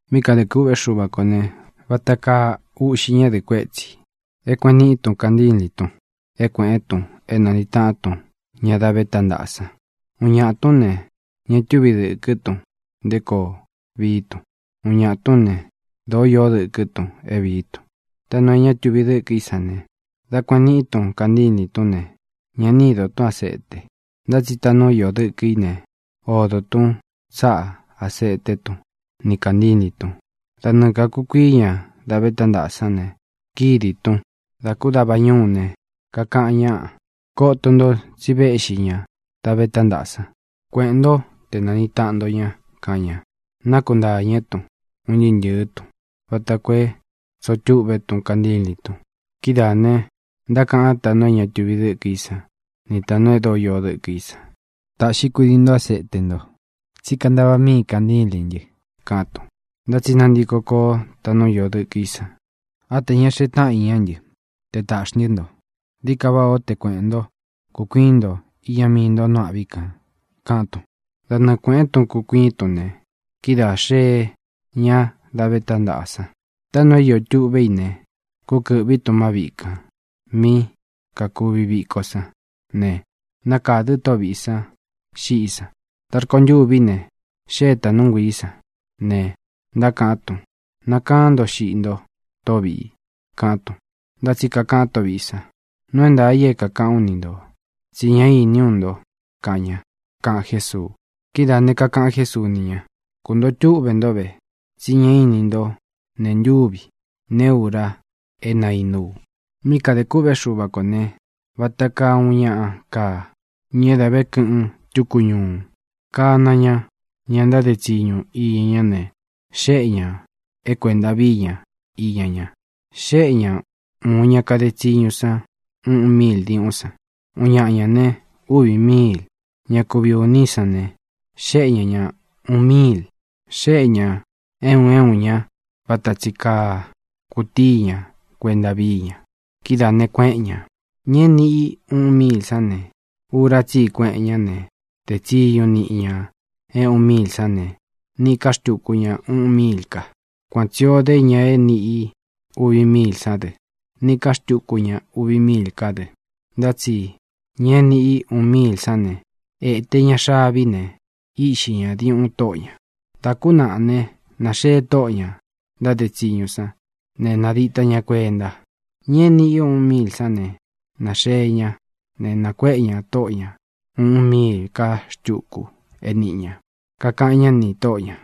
ʼMí kadē kûꞌvé Xuva kō ne, vata kaa uꞌxi ñádɨ̄ꞌɨ kuétsī é kuēꞌen niꞌí tun kantílīn tun é kuēꞌén tun é nāniꞌi taꞌán tun ña da vé tántaꞌa san. Úꞌun ñāꞌa tún ne, ña túvi dɨ̄kɨ́ tun nté koo vií tun. Úꞌun ñāꞌa tún ne, dōó iō dɨkɨ́ tun é vīí tun. Taꞌnu é ña tuvi dɨ́kɨ í san ne, dā kueꞌen niꞌí tun kantílīn tún ne, ña ni ídō tún asete. Ntá tsi taꞌnu íō dɨkɨ í ne, odō tún tsáꞌa āseté tun ni kāntílīn tun. Da nɨɨ kākukuii ña da vé tántaꞌa sán ne, kídī tun. Dā kú dava ñúu ne, kakaꞌan ñáꞌa: “Koto nto tsi véꞌxi ña da vé tántaꞌa san. Kueꞌēn ntó te nāniꞌi taꞌan nto ña”, kaꞌan ña. Nákuntāñɨ́ tun, un ntɨɨ́ ntɨ̄ɨ́ tun, vata koo é tsoo túꞌve tún kantílīn tun. Kidáā ne, ntákaꞌan táꞌnu é ña tuvi dɨ́kɨ í san ni tāꞌnu e dóo iō dɨkɨ í san: “Tāꞌxi kudii nto áseche nto, tsí kantaꞌva míī kanchílīn ntɨ”, kaꞌán tun. Ntá tsi nantiko koó taꞌnu íō dɨkɨ í san: “Á chē ña xee táꞌan iñá ntɨ che tāꞌxi ntɨ́ nto. Dií ka váꞌā ó che kuēꞌen ntó, kūkuiín nto iña mii nto nu âꞌví kān”, kaꞌán tun. Da nɨɨ kuēꞌen tún kūkuiín tun ne, kidáā xeé ña da vé tántaꞌa san. Taꞌnu é iō tuꞌvé i ne, kúkɨ̄ꞌví tun má viꞌi kān mí kakūvi viko sán ne, nakādɨ tóꞌo vīꞌi sán xiꞌí san. Dā rkontûví ne, xée tāꞌnú nguiī sán ne, ntákaꞌán tun: “¡Nakaán nto xiꞌi nto, tóꞌo vīꞌi!”, kaꞌán tun. Ntá tsi kakaꞌan tóꞌo vīꞌi san: “Nuu é ntaā i é kākaꞌán u ni ntō, tsí ña iní u nto”, kaꞌan ña —kaꞌan Jésuu. Kidáā ne, kakaꞌan Jésuu ni ña: —Kuntōo túꞌve ntó ve, tsí ña ini nto nee ntúvi, neé ura é naínú u. ʼMí kadē kûꞌvé Xuva kō ne, vata kaa uun ñaꞌa kaa, ña é dā ve kɨꞌɨn túku ñuu. Kāna ña ña ntáde tsiñu iña ñá ne, xéꞌe ñā é kuēnta víi ña iña ña. ʼXéꞌe ña ūun ña kade tsiñu san uꞌun míil diuꞌún san. Uun ñaꞌa ñā né, uvi míil. Ña kuvi ūní san ne, xéꞌe ña ña ūun míil. Xéꞌe ñā é un é un ña vata tsi kaa kutíi ña kuenta víi ña. Kidáā ne, kuéꞌen ñā. Ña é niꞌi í uꞌun míil sán ne, ura tsí i kueꞌen ñá ne, dé tsiñu niꞌi ña é uꞌun míil sán ne, níꞌi ka xtūku ña uꞌun míil ka. Kuan tsī o dé ña é nīꞌi i uvi míil sán dɨ. Níꞌī ká xtukú ña uvi míil ká dɨ. Ntá tsi ña é niꞌi i uun míil sán ne, ēte ña xavi ne, íꞌxi ñā diuꞌun tóꞌo ñā. ʼDā kú naꞌa ne, nāxee tóꞌō ña ntáde tsiñu san ne, nadita ñá kuenta. Ña é nīꞌi i é uꞌun míil sán ne, nāxee ñá ne, nākuéꞌe ñā tóꞌo ña ūꞌun míil ká xtuku é nīꞌi ña. Kakaꞌan ñá nī tóꞌo ñā: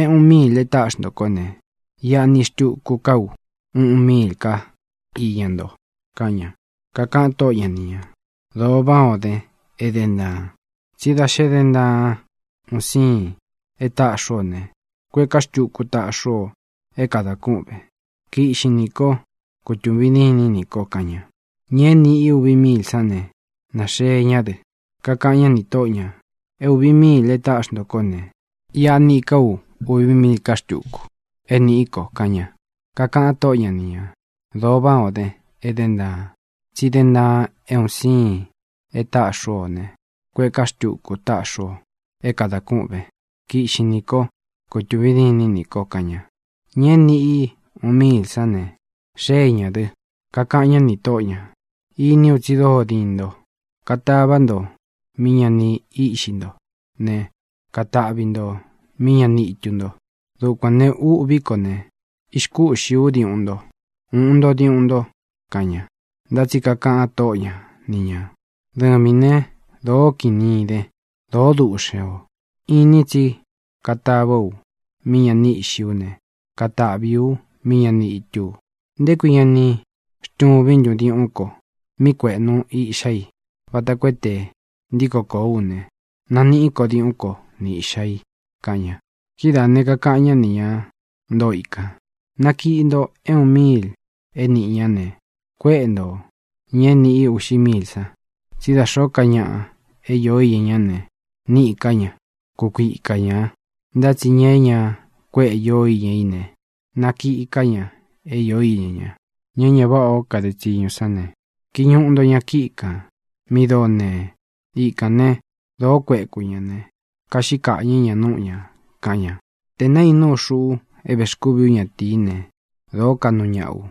“É ūꞌun míil e táꞌxi nto kó ne, iꞌa niꞌi xtuku ká u uꞌun míil ká iña nto”, kaꞌan ña. Kakaꞌan tóꞌo ña ni ñā: “Dōo váꞌā o den, e dén ntaan. Tsí da xe dén ntaan un sīin e táꞌxī ú o ne, kuéꞌē ká xtuku táꞌxī ú o é kadān kuꞌven. Kiꞌxin nī kó, kutūvin dînín nī ko”, kaꞌan ña. Ña é nīꞌi i uvi míil sán ne, nāxee ñá dɨ. Kakaꞌan ñá nī tóꞌo ñā: “É ūvi míil e táꞌxi ntō kó ne, iꞌa niꞌi ká u uvi míil ká xtuku, é nīꞌí ko”, kaꞌan ña. Kakaꞌan tóꞌo ña ni ñā: “Dōo váꞌā o dén, e dén ntaan. Tsi dén ntaan é un siin e táꞌxī ú o ne, kuéꞌē ká xtuku táꞌxī ú o é kadān kúꞌvēn. Kiꞌxin nī kó, kūtuvin dínin nī ko”, kaꞌan ña. Ña é nīꞌi i uun míil sán ne, xée ñā dɨ. Kakaꞌan ñá ni tōꞌó ña: “Iní u tsi dóo diin nto. Katava nto mí ña ni íꞌxi nto ne, kataꞌvi nto mí ña ni itu nto. Dukuān ne, ûꞌví ko ne, ixkúꞌxī ú diuꞌun nto. Uꞌun nto diuꞌun nto”, kaꞌan ña. Ntá tsi kakaꞌan tóꞌo ña ni ñā: “Dɨvīn né, dōo kini iden, dōó duꞌxen ō. Inin tsí katāvá u mí ña ni íꞌxī ú ne, kataꞌvī ú mí ña ni itú u. ¿Nté kui ña ni xtuvín ntun diuꞌún ko mí kueꞌnu iꞌxá i, vata koo é te ntiko kōó u ne, naniꞌí ko diuꞌún ko ni īꞌxa i?”, kaꞌan ña. Kidáā ne, kakaꞌan ñá ni ña ntoo ikān: “Nakiꞌi nto é uun míil é nīꞌi ñá ne, kuéꞌe nto ñā é nīꞌi i uꞌxi míil san. Tsí da xōó ka ñaꞌa é īo iña ñá ne, níꞌī ká ña; kukuika ñā. Ntá tsi ña é ña kuéꞌe īó iña í ne, nakiꞌi ká ña é īó iña ña. Ña é ña váꞌā ó kade tsiñu sán ne, kiñuꞌu nto ña kíꞌi kān mi dóo nee. Ikān né, dōó kueku ña ne, kaꞌxí kaꞌñɨ̄ ña núꞌu ñā”, kaꞌan ña. ʼTē naínú u, xuꞌu é vēxkúvī ú ñatīí ne, dōó kaꞌnu ñaꞌa u.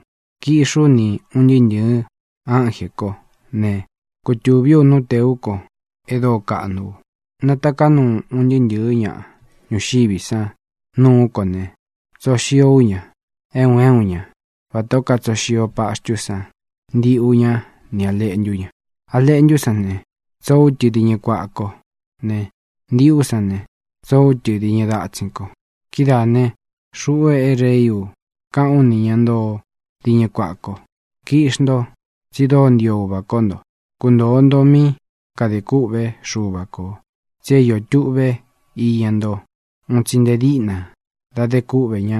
Kiꞌxi ú ni ūn ntɨɨ́ ntɨ̄ɨ́ ánjē kó ne, kutūví u nú tēú ko e dóo kaꞌnu u. Nataká nuu un ntɨɨ́ ntɨ̄ɨ́ ña ñuxiví san nuú ko ne, tsoo xio ú ña, é un é un ña, vatā ó katsoo xio paxtú san ndiꞌu ñá ni lēꞌntu ña. A leꞌntú san ne, tsoo ú tɨ diñɨ kuaꞌa kó ne, ndiꞌu sán ne, tsoo ú tɨ diñɨ datsin ko. Kidáā ne, xuꞌu é Rei ú kaꞌán u nī ña ntoo diñɨ kuaꞌa ko: “Kiꞌxi nto, tsi dóo ntio Uva kó nto. Kuntōo nto mí kadē kûꞌvé Xuva kō tsi é īó tuꞌve iña nto un tsi nte díꞌna dá de kúꞌvē ñá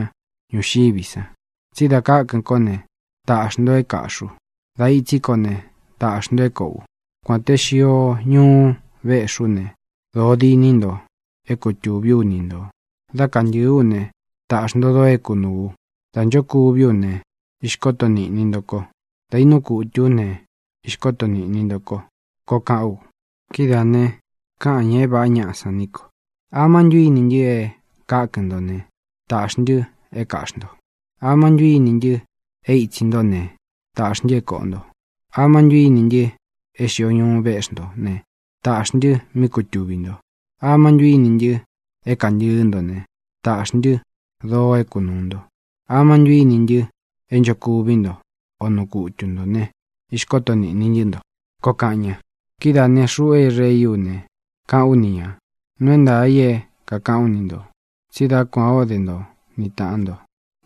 ñuxiví san. Tsí dā kákɨ̄n kó ne, taꞌxī nto é kāꞌxí u. Dā itsí ko ne, taꞌxī nto é kōꞌo u. Kuān te xio ñuú véꞌxī ú ne, dōo diní nto é kutūví u ni ntō. Dá kantɨ̄ɨ́ u ne, taꞌxī nto doo é kunūu u. Dá nchokuví u ne, īxkoto niꞌni nto ko. Dá inuu kutu ú ne, īxkoto niꞌni nto ko”, koo kaꞌán u. Kidáā ne, káꞌān ña é vāꞌá ñaꞌa san ní ko: “¿Amá ntu ini ntɨ e kákɨn ntō ne, tāꞌxí ntɨ é kāꞌxi nto? ¿Amá ntu ini ntɨ e itsi ntó ne, tāꞌxí ntɨ é kōꞌo nto? ¿Amá ntu ini ntɨ́ e xio ñuú veꞌxi nto ne, tāꞌxí ntɨ mí kutuvī nto? ¿Amá ntu ini ntɨ e kantɨɨ́ nto ne, tāꞌxí ntɨ doo é kunūu nto? ¿Amá ntu íni ntɨ é nchokuví nto, o nuu kutu ntō ne, ixkóto nīꞌni ntɨ́ nto?”, koo kaꞌan ña. Kidáā ne, xuꞌu é Reí u ne, káꞌān ú ni ñā: “Nuu é ntaā i é kākaꞌán u ni ntō, tsí da kuān ó de nto ni tāꞌan nto,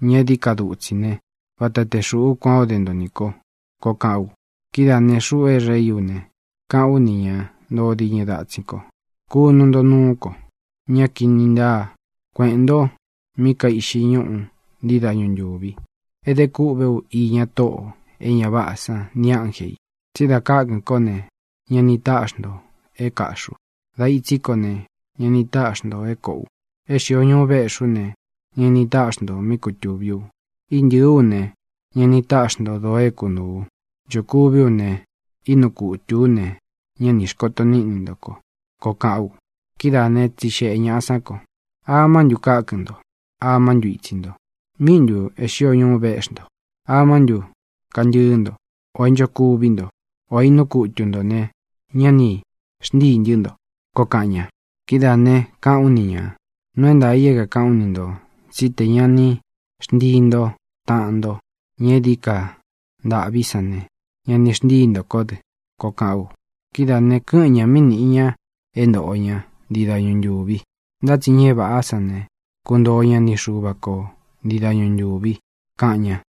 ña é dií ka dutsi ne, vata te xūꞌu kuán o de nto nī ko”, koo kaꞌán u. ʼKidáā ne, xuꞌu é Reí u ne, káꞌān ú nī ña ntoo diñɨ datsin kó: “Kunu nto nuú ko, ña kini ntáa. Kueꞌēn nto mí kaiꞌxi ñúꞌu ntii dañu ntūvi, é de kûꞌvé u iña tóꞌō e ña váꞌā san nī ánje ī. Tsí dā kákɨn kó ne, ña ni táꞌxi ntō é kāꞌxí u. Dā itsí ko ne, ña ni táꞌxi ntō é kōꞌo u. É xīo ñuú véꞌxī ú ne, ña ni táꞌxi ntō mí kutūví u. Íntɨ̄ɨ́ u ne, ña ni táꞌxi nto dōo é kunūu u. Nchokuví u ne, ínuu kutū ú ne, ñá ni īxkoto níꞌni nto ko”, koo kaꞌán u. Kidáā né, tsixeꞌe ñāꞌa sán ko: “¿Amá ntu kákɨn ntō? ¿Amá ntu itsi nto? ¿Míꞌi ntū é xio ñuú veꞌxi nto? ¿Amá ntu kantɨ́ɨ nto, ō é nchokuví nto, o inuu kutu ntō ne, ña ni xntíi ntɨ́ nto?”, koo kaꞌan ña. Kidáā ne, káꞌān ú ni ñā: “Nuu é ntaā i é kākaꞌán u ni ntō, tsí te ña ni xntii nto taꞌán nto, ña é dií ka ntāꞌví san ne, ña ni xntíi nto kó dɨ”, koo kaꞌán u. Kidáā ne, kɨ́ꞌɨn ñā mí nīꞌi ña é ntoꞌo ña ntii dañu ntūvi. Ntá tsi ña é vāꞌá san ne, kuntoo ña ni Xuva ko ntii dañu ntūvi —kaꞌan ña.